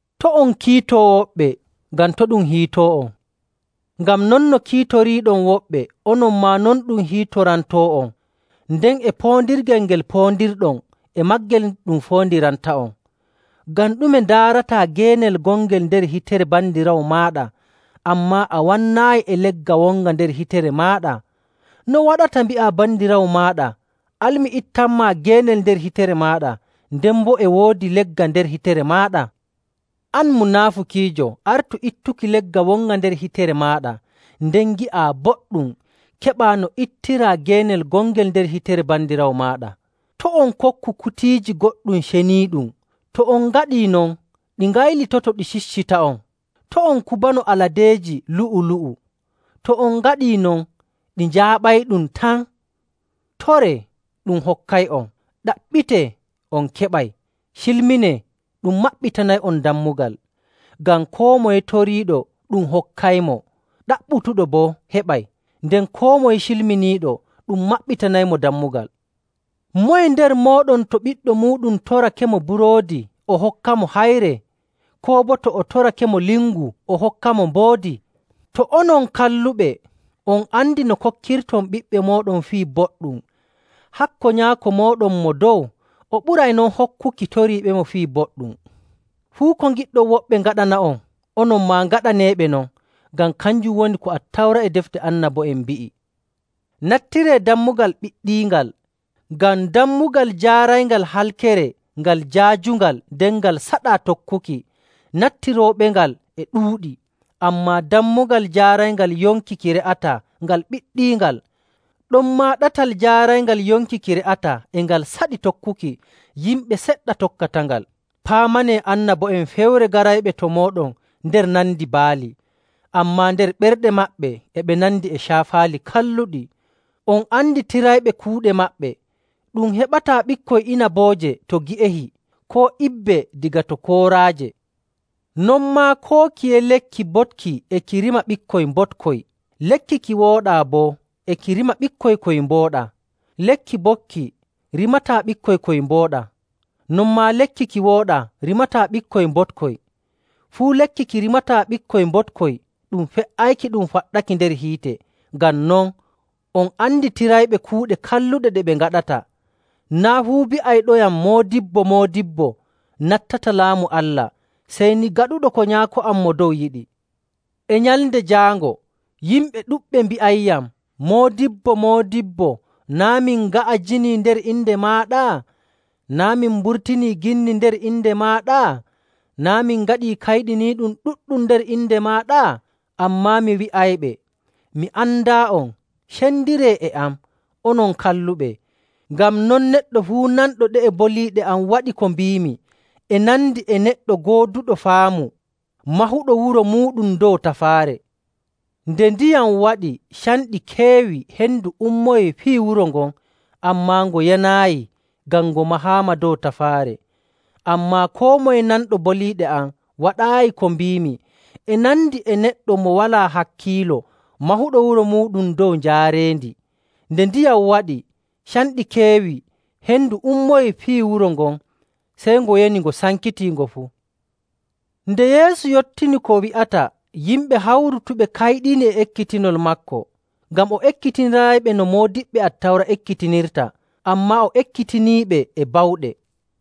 “To' on kiito woɓɓe, ngam to' ɗum hiito'on. Ngam non no kiitoriiɗon woɓɓe, onon maa non ɗum hiitorantoo'on, nden e poondirgel ngel poondirɗon, e maagel ɗum foondiranta'on.. Ngam ɗume ndaarataa geenel gongel nder hitere bandiraawo maaɗa, ammaa a wannaayi e legga wonga nder hitere maaɗa? No waɗata mbi'aa bandiraawo maaɗa, ‘Al mi ittanmaa geenel nder hitere maaɗa,’ nden boo e woodi legga nder hitere maaɗa? An munaafukiijo, artu ittuki legga wonga nder hitere maaɗa, nden ngi'aa boɗɗum keɓaa no ittiraa geenel gongel nder hitere bandiraawo maaɗa. “To' on kokku kutiiji goɗɗum ceniiɗum. To on ngaɗii non, ɗi ngaylitoto, ɗi ciccita'on. To' on kubano aladeeji lu'u‑lu'u. To on ngaɗii non, ɗi njaaɓayɗum tan. “Toree, ɗum hokkay'on. Ɗaɓɓitee, on keɓay. Cilminee, ɗum maɓɓitanay'on dammugal. Ngam koo moye toriiɗo ɗum hokkaymo, ɗaɓɓutuɗo boo heɓay, nden koo moye cilminiiɗo ɗum maɓɓitanaymo dammugal. Moye nder mooɗon to ɓiɗɗo muuɗum torakemo buroodi, o hokkamo hayre? Koo boo to o torakemo lingu, o hokkamo mboodi? To onon kalluɓe, on andi no kokkirton ɓiɓɓe mooɗon fii boɗɗum, hakko Nyaako mooɗon Mo Dow! O ɓuray non hokkuki toriiɓemo fii boɗɗum! “Fuu ko ngiɗɗon woɓɓe ngaɗana'on, onon maa ngaɗaneeɓe non, ngam kanjum woni ko Attawra e Defte Annabo'en mbi'i.. “Nattiree dammugal ɓiɗɗiingal. Ngam dammugal jaarayngal halkere ngal jaajungal, nden ngal saɗaa tokkuki, nattirooɓengal e ɗuuɗi. Ammaa dammugal jaarayngal yonki ki re'ataa ngal ɓiɗɗiingal, ɗonmaa ɗatal jaarayngal yonki ki re'ataa e ngal saɗi tokkuki, yimɓe seɗɗa tokkatangal. “Paamanee annabo'en fewre garayɓe to mooɗon nder nandi baali, ammaa nder ɓerɗe maɓɓe e ɓe nandi e caafaali kalluɗi. On anditirayɓe kuuɗe maɓɓe. Ɗum heɓataa ɓikkoy inabooje to gi'ehi, koo ibbe daga to kooraaje. Non maa, koo kiye lekki boɗki e ki rima ɓikkoy mboɗkoy. Lekki ki wooɗaa boo e ki rima ɓikkoy koy mbooɗaa. Lekki boɗki rimataa ɓikkoy koy mbooɗaa. Non maa, lekki ki wooɗaa rimataa ɓikkoy mboɗkoy. Fuu lekki ki rimataa ɓikkoy mboɗkoy ɗum fe''ayki ɗum faɗɗaki nder hiite.. Ngam non, on anditirayɓe kuuɗe kalluɗe ɗe ɓe ngaɗata.. “Naa' fuu bi'ayɗoyam, ‘Moodibbo, Moodibbo,’ nattata Laamu Allah, sey ni gaɗuɗo ko Nyaako am Mo Dow yiɗi. E Nyalnde Jaango yimɓe ɗuɗɓe mbi'ayyam, ‘Moodibbo, Moodibbo! Naa' min nga'ajinii nder inde maaɗa? Naa' min mburtinii ginni nder inde maaɗa? Naa' min ngaɗii kayɗiniiɗum ɗuɗɗum nder inde maaɗa?’ Ammaa mi wi'ayɓe, ‘Mi andaa'on. Cendiree e am, onon kalluɓe.’. “Ngam non, neɗɗo fuu nanɗo ɗe'e boliiɗe am waɗi ko mbiimi e nandi e neɗɗo gooduɗo faamu mahuɗo wuro muuɗum dow tafaare. Nde ndiyam waɗi, canɗi keewi, hendu ummoyii piyi wuro ngon, ammaa ngo yanaayi ngam ngo mahaama dow tafaare. “Ammaa koo moye nanɗo boliiɗe am waɗaayi ko mbiimi e nandi e neɗɗo mo walaa hakkiilo mahuɗo wuro muuɗum dow njaareendi. Nde ndiyam waɗi, canɗi keewi, hendu ummoyii piyi wuro ngon, sey ngo yani ngo sankitii ngo fuu.” Nde Yeesu yottini ko wi'ata, yimɓe hawrutuɓe kayɗini e ekkitinol maako, ngam o ekkitiniraayiɓe no moodiɓɓe Attawra ekkitinirta, ammaa o ekkitiniiɓe e bawɗe..